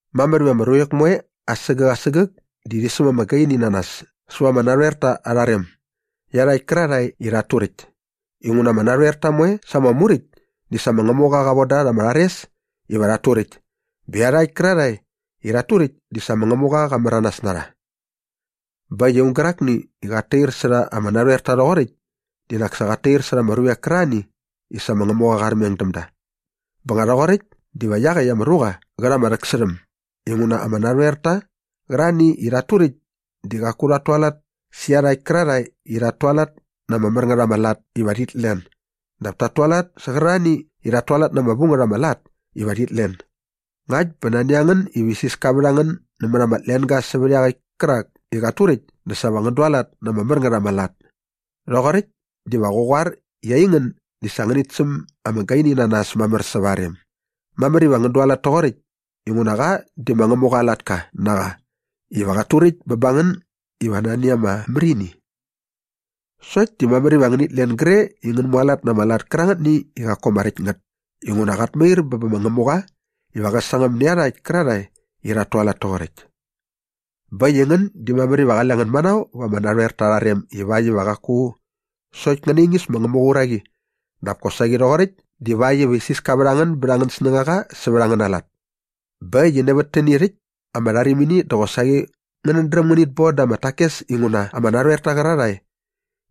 Mamär iva ama ruvek moe asägäk asägäk di rhi säm ama gaini na nas säva ama narhoerta aa rem iarhakt kärarhae i rhat turäkt inguna ama narhoerta moe sa ama muräkt di sa ma Ngämuqa qa von da rha ama rhares iva rhat turäkt bä iarhakt kärarhae i rhat turäkt di sa ma Ngämuqa qa märanas na rha. Bä äkt i aung gärakni i qat tair särha ama narhoerta rhoqoräkt di nak sa qat tair särha ama ruvek kärarhani i sa ma Ngämuga qa armeng däm da. Bä nga rhoqoräkt diva iaqäkt ama ruqa qä rha ama rhäksärhäm inguna ama narhoerta qärarhani i rhat turäkt di qaku rhat tualat sä iarhakt kärarhae i rhat tualat na ama mär ngät ama lat iva rhit len dap ta tualat sä qärarhani i rhat tualat na ama vu ngät ama lat iva rhit len. Ngakt bä nani a ngän iva isiska vät a ngän nämät ama tlenga sävät iaqäkt kärak i qat turäkt dä sa va ngän dualat na ama mär ngät ama lat. Rhoqoräkt diva qä qoar i aingän di sa ngänit säm ama gaini na nas mamär säva aa rem. Mamär iva ngän dualat toqoräkt inguna qa di ma Ngämuqa aa latka na qa iva qat turäkt bä ba ngän iva nani ama märini. Sokt di mamär iva ngänit len gre i ngän mualat na ama lat kärangätni i qaku ama räkt ngät inguna qat mair bä bä ma Ngämuqa iva qä sangäm nä iarhakt kärarhae i rhat tualat toqoräkt. Bä äkt i ngän di mamär iva qale ngän manao va ama narhoerta arha rem ivakt iva qaku sokt ngän naingis ma Ngämuqa aa uraqi dap kosaqi rhoqoräkt divakt iva isiska vät a ngän bät angän snängaqa sävät angäna lat. Bä äkt i nävät täni rhäkt ama rharimini dä qosaqi ngänät dräm ngänit bon da ama takes inguna ama narhoerta qärarhae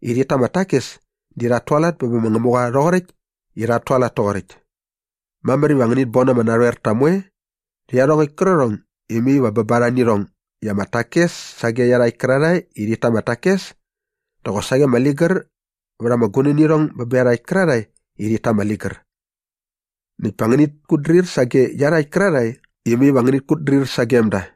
i rhit ta ama takes di rhat tualat bä bä ma Ngämuqa rhoqoräkt i rhat tualat toqoräkt. Mamär iva ngänit bon ama narhoerta moe rhä iarhongäkt kärqärhong i mai va bä ba rha nä irhong i ama takes sage iarhakt kärarhae i rhit ta ama takes dä qosaqi ama ligär vät ama gunänirhong bä bä iarhakt kärarhae i rhit ta ama ligär. Näkt pa ngänit kutdrir sage iarhakt kärarhae i mai va ngänit kutdrir sagem da.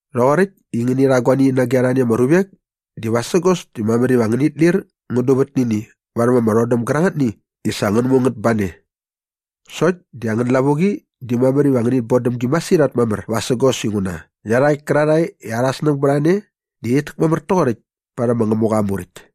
Rhoqoräkt i ngäni rha guani nage arhani ama ruvek di vasägos di mamär iva ngänit lir ngän duvät nä ini varhäm ama rhodäm gärangätni i sa ngän mu ngät ba ne. Sokt di angän lavuqi di mamär iva ngänit bodäm gi masirhat mamär vasägos inguna iarhakt kärarhae i arhä snäng bät a ne di rhit täkmamär toqoräkt parhäm ma Ngämuqa aa Muräkt.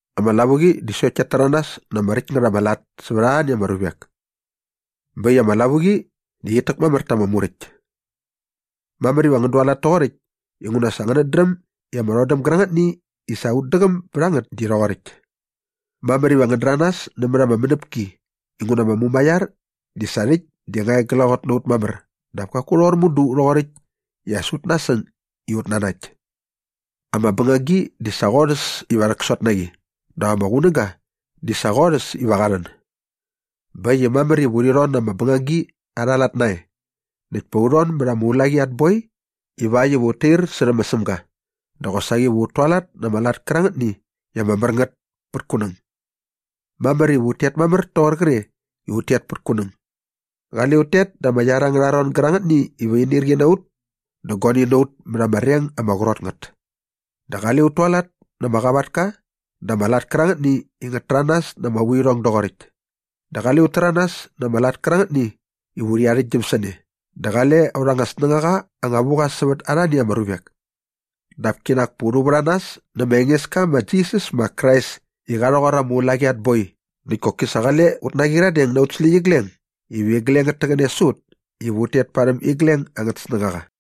Ama lavuqi di sokt kiat täranas na ama räkt ngät ama lat sävät arhani ama ruvek. Bä äkt i ama lavuqi di qit täkmamär ta ama Muräkt. Mamär iva ngän dualat toqoräkt inguna sa ngänät dräm i ama rhodäm gärangätni i sa ut däqäm bät a ngät di rhoqoräkt. Mamär iva ngän däranas nämät ama mänäpki inguna ama mumaiar di sa rhäkt di nga e glaqot na ut mamär dap kaku rhoqor mudu rhoqoräkt i as ut nasäng i ut nanakt. Ama bängagi di sa qorhäs iva rhäksot na qi dap ama qunäga di sa qorhäs iva qa rhän. Bä äkt i mamär iva urhi rhon na ama bängagi arha lat nae näkt pa u rhon mät ama ulaqi at boi ivakt iva ut tair särhä ma Sämga dä qosaqi va ut tualat na ama lat kärangätni i ama mär ngät pät kunäng. Mamär iva ut tet mamär toqor qre i ut tet pät kunäng. Qale ut tet da ama iar angärha ron gärangätni iva inirqi na ut dä guani na ut mät ama reng ama qrot ngät. Dä qale ut tualat na ama qavatka dä ama lat kärangätni i ngät täranas na ama vuirhong doqoräkt. Dä qale ut täranas na ama lat kärangätni iva urhi arhäktgyäm sä ne dä qale aurha anga snängaqa anga vu qa sävät arhani ama ruvek. Dap kinak pa u rhu vät a nas nä ma Engeska ma Jisas ma Krais i qa rhoqor ama ulaqi at boi näkt koki sa qale ut naqyiradeng na aut släqyigleng iva igleng ngät täqäne sä ut iva ut tet parhäm igleng angät snängaqa.